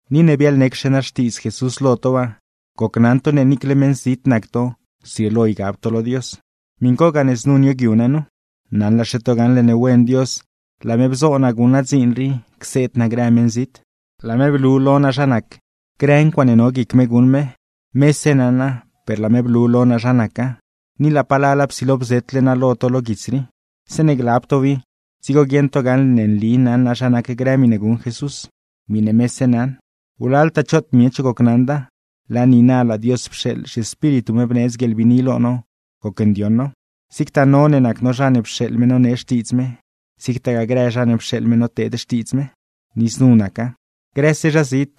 Ni ne biaḻnecxe naa Xtiidz Jesús lo to waa, gocnaṉ to ne niicle meṉ zit nac to zrieelo ygab to lo Dios, miṉ co gane znu nioogyu naa nu. Naṉlaxe to gaṉle ne wen Dios, laa me bzo naa guṉ naa dziin rii cseed naa grë meṉzit. Laa me blu lo naa zha nac grë ncuaaṉe no guic me guṉ me, mese naṉa per laa me blu lo naa zha naca, ni laa palala psilo bzetle naa lo to lo guits rii. Zeeṉe glab tow i, dzigo guieṉ to gaṉle ne nli naṉ naa zha nac grë miṉe guṉ Jesús, miṉe mese naṉ. Wlaltaa choot miech gocnaṉda, laa niina laa Dios pxeeḻ zhiEspíritu me bneedz guieḻbiini lo no gocndioṉ now, zigtaa no ne nac no zha ne pxeeḻ me nonee xtiidz me, zigtagaa grë zha ne pxeeḻ me noteed xtiidz me. Ni znu naca: grëse zha zit,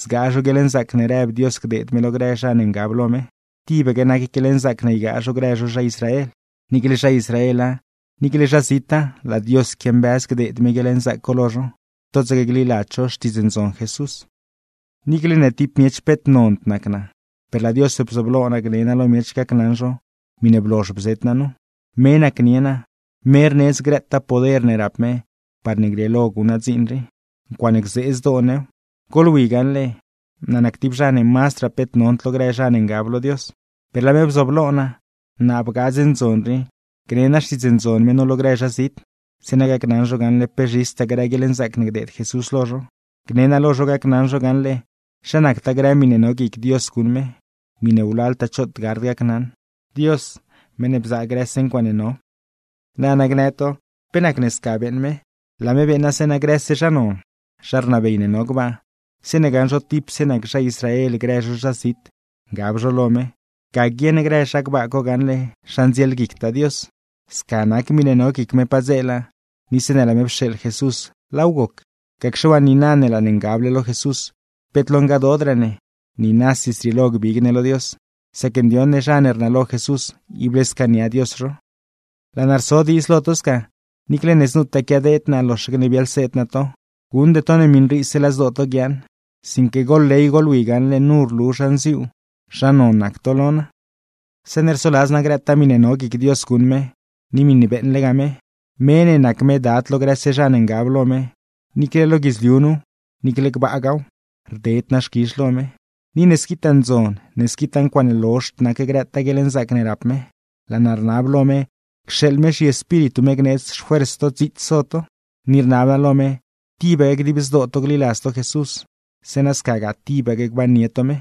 zgaa zho guieḻnzaac ne rëb Dios gdeed me lo grë zha ne ngab lo me, tibaque nac guieḻnzaac ne ygaa zho grë zho zha Israel. Niicle zha Israela, niicle zha zita, laa Dios quiambëz gdeed me guieḻnzaac co lo zho, totsaque gliladz zho Xtiidz Ndzon Jesús. Niicle ne tib miech peet nond nac naa, per laa Dios bzooblo naa gne naa lo miech gacnaṉ zho miṉe blozh bzet naa nu, me nacnie naa, me rneedz grëtaa poder ne rap me parne grieelo guṉ naa dziin rii. ¡Ncuaaṉe gzee zdoo new! Goḻwi gaṉle, naa nac tib zha ne mazdraa peet nond lo grë zha ne ngab lo Dios; per laa me bzooblo naa, naa bgaa dze ndzon rii gne naa Xtiidz Ndzon me nu lo grë zha zit, zeeṉa gacnaṉ zho gaṉle pe zhistaa grë guieḻnzaac ne gdeed Jesús lo zho. Gne naa lo zho gacnaṉ zho gaṉle zha nactaa grë miṉe no guic Dios guṉ me, miṉe wlaltaa choot gard gacnaṉ; Dios, meṉ ne bzaa grëse ncuaaṉe no. Nana gnë to: “¿Pe nacne sca beeṉ me?” Laa me beeṉa zeeṉa grëse zha non, zha rnabey ne no gbaa, zeeṉe gaṉ zho tipse nac zha Israel grë zho zha zit ngab zho lo me, ga guieṉ grë zha gbaa co gaṉle zha ndzielguictaa Dios. Sca nac miṉe no guic me padzeela, ni zeeṉe laa me pxeeḻ Jesús laaw goc. Gacxe waa, niina ne laa ne ngable lo Jesús, peet lo ngadoodraa ne, niinasi zrieelo gbig ne lo Dios, sac ndioṉ ne zha ne rnalo Jesús ible scaania Dios zho. Laa naa rso diidz lo to sca, niicle ne znutaa quiadeed naa loxaque ne biaḻseed naa to, guṉde to ne miṉriise laa zdoo to guiaaṉ, sinque goḻley goḻwi gaṉle nu rlu zha nziuu, zha non nac to lo naa. Zeeṉe rsoladz naa grëtaa miṉe no guic Dios guṉ me, ni miṉe beeṉlegaa me (me ne nac me Dad lo grëse zha ne ngab lo me, niicle lo guidzliu nuw, niicle gbaagaaw); rded naa xquizh lo me. Ni ne squitaa ndzon, ne squitaa ncuaaṉe lozhd nac grëtaa guieḻnzaac ne rap me, laa naa rnab lo me cxeeḻ me zhiEspíritu me gneedz xfuers to dziits so to. Ni rnab naa lo me tibaque dib zdoo to gliladz to Jesús, zeeṉa scagaa tibaque gbannie to me,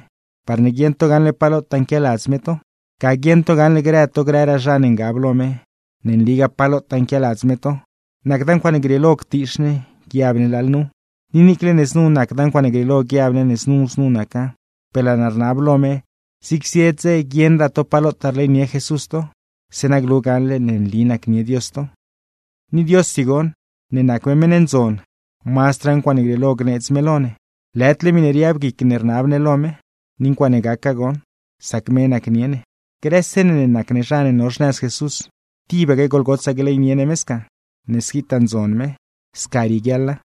parne guieṉ to gaṉle pa lotaa nquialadz me to. Ga guieṉ to gaṉle grë to grëraa zha ne ngab lo me, ne nligaa pa lotaa nquialadz me to, nacda ncuaaṉe grieelo ctiix ne, guiab ne lalnuw. Niicle ne znu nacda ncuaaṉe grieelo guiab ne znu znu naca, per laa naa rnab lo me zig zie dze guieṉraa to pa lotaa rleynie Jesús to; zeeṉa glu gaṉle ne nli nacnie Dios to. Ni Diossi goṉ ne nac me meṉ ne ndzon, mazdraa ncuaaṉe grieelo gneedz me lo ne, lëdle miṉe riab guic ne rnab ne lo me; ni ncuaaṉe gaca goṉ, sac me nacnie ne. Grëse ne ne nac ne zha ne no xnëz Jesús, ¡tibaque goḻgotsaa gleynie ne me sca, ne squitaa ndzon me! Sca rieguiaḻa.